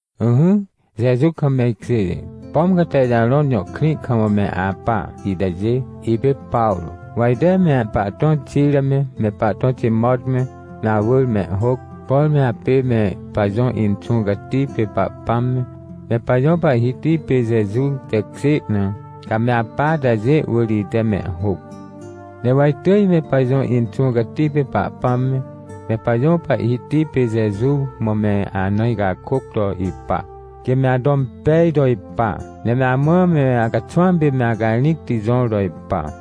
Ỹhỹ, Jeju kam me ikjêjê, pom ca Texarõn jõ krĩ kam me apa itajê, ipê Pawrô, wa ite me pahtõ Xira me, me pahtõ Timot me, me awỳr mehhôc. Por me apê me pajõ Inxũ Cati pê Pahpãm me, me pajõ Pahhiti pê Jeju tekjê na, ca me apa atajê wỳr ite mehhôc. Ne wa itỳj me pajõ Inxũ Cati pê Pahpãm me, me pajõ Pahhiti pê Jeju mã me ana icakôc to ipa, quê me ato impej to ipa, ne me amã me acaxwãm pê me acarĩcti jõr to ipa.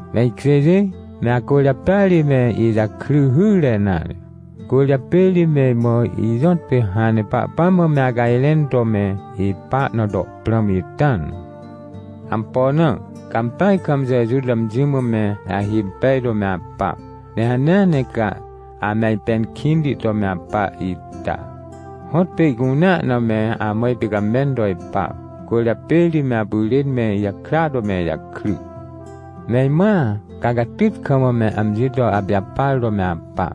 Me ikjêjê, me acwỳrjapêa ri me ijakry hyre nare. Cwỳrjapê ri me imã ijõtpê hãn ne Pahpãm mã me acajrẽn to me ipa na to prãm ita na. Ampo na? Ca ampeaj kam Jeju to amji mã me ahimpej to me apa. Ne hanea ne ca ame ajpẽn kĩnti to me apa ita, hõtpê ihcunea na me amã ipicamẽn to ipa, cwỳrjapê ri me apyrên me ijakrya to me ijakry. Me imãa, ca catyt kam me amji to apijapar to me apa.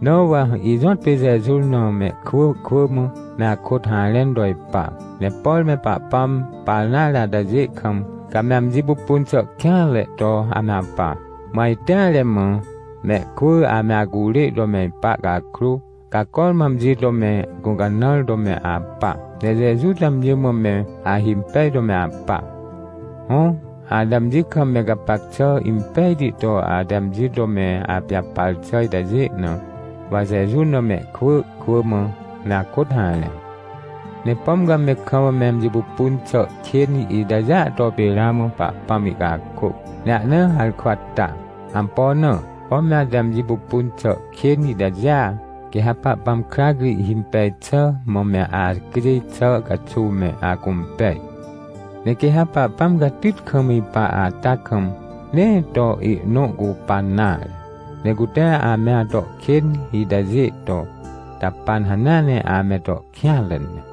Na wa ijõtpê Jeju na mehkwỳ kwỳ mã me akôt harẽn to ipa. Ne por me Pahpãm par nare atajê kam, ca me amji pupun xà kêanre to ame apa, mã ajteare mã, mehkwỳ ame acurê to me ipa cakrô, ca cormã amji to me gũcanãr to me apa, ne Jeju to amji mã me ahimpej to me apa. Hõ, ate amji kam me gapac xà impejti to ate amji to me apijapar xà itajê na, wa Jeju na mehkwỳ kwỳ mã me akôt harẽ. Ne pom ca me kam me amji pupun xà kên itajêa to pê ramã Pahpãm ihcakôc, ne ahna harkwa ta. Ampo na? Pom me ate amji pupun xà kên itajêa, quê ha Pahpãm krac ri himpej xà mã me acjêj xà caxuw me acũmpej. Ne quê ha Pahpãm catyt kam ipa ata kam, nee to ihnõ cupan nare, ne cute ame ato kên itajê jahpan xà na hanea ne ame to kêanre ne.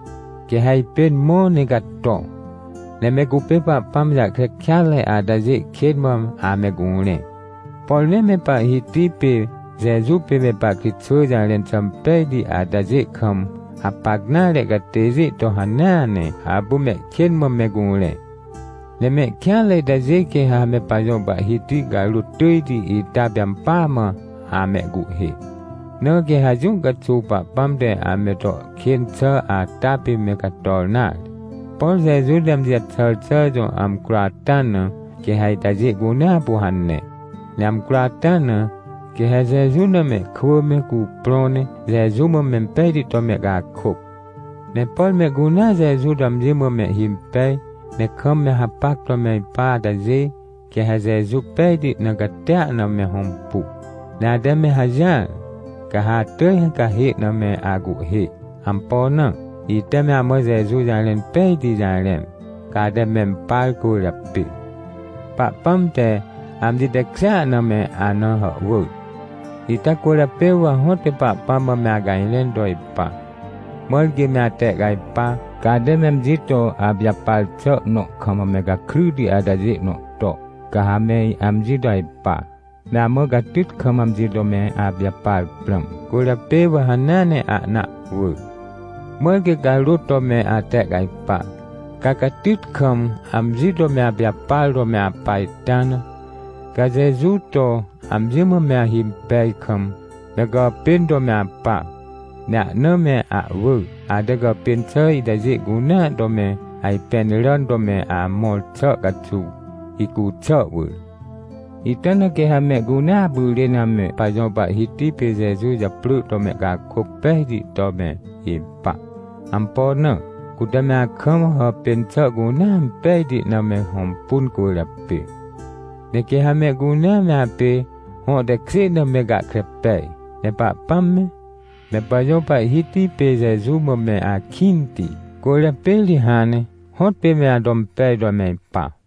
Quê ha ajpên mõ ne cato, ne me cupê Pahpãm jahkre kêatre atajê kên mã ame curẽ. Por nee me Pahhiti pê Jeju pê me pahkritxwỳ jarẽn xà impejti atajê kam hapac nare catêjê to hanea ne apu mehkên mã me curẽ. Ne mehkêanre itajê quê ha me pajõ Pahhiti carôt tỳjti ita pê ampỳa mã amehcuhhê. Na quê ha jũ caxuw Pahpãm te ame to kên xà ata pê me cator nare. Por Jeju te amji jaxàr xà jõ amcro ata na quê ha itajê cunea apu hane. Ne amcro ata na, quê ha Jeju na mehkwỳ me cuprõ ne Jeju mã impejti to mehcakôc. Ne por mehcunea Jeju to amji mã mehhimpej, ne kam me hapac to me ipa atajê, quê ha Jeju pejti ne catia na me hõmpu. Ne ate me hajỹar, ca ha atỳj cahê na me acuhhê. Ampo na? Ite me amã Jeju jarẽn pejti jarẽn, ca ate mempar cwỳrjapê. Pahpãm te amji tekjêa na me ana hàhwỳr. Ita cwỳrjapê wa hõtpê Pahpãm mã me acajrẽn to ipa, mãr quê me atehcajpa, ca ate me amji to apijapar xà nõ kam me gakryti atajê nõ to, ca ha me amji to ajpa. Me amã catyt kam amji to me apijapar prãm, cwỳrjapê wa hanea ne ahna ahwỳ, mãr quê carôt to me atehcajpa, ca catyt kam amji to me apijapar to me apa ita na. Ca Jeju to amji mã me ahimpej kam, me gàpên to me apa, ne ahna me ahwỳ, ate gàpên xà itajê cunea to me ajpẽn ràn to me amõr xà caxuw, hicu xà wỳr. Ita na quê ha mehcunea apyrên ame pajõ Pahhiti pê Jeju japrỳ to mehcakôc pejti to me ipa. Ampo na? Cute me akam hàpên xà cunea impejti na me hõmpun cwỳrjapê. Ne quê ha mehcunea me apê hõ tekjê na me gahkre pej. Ne Pahpãm me, me pajõ Pahhiti pê Jeju mã me akĩnti, cwỳrjapê ri hãn ne hõtpê me ato impej to me ipa.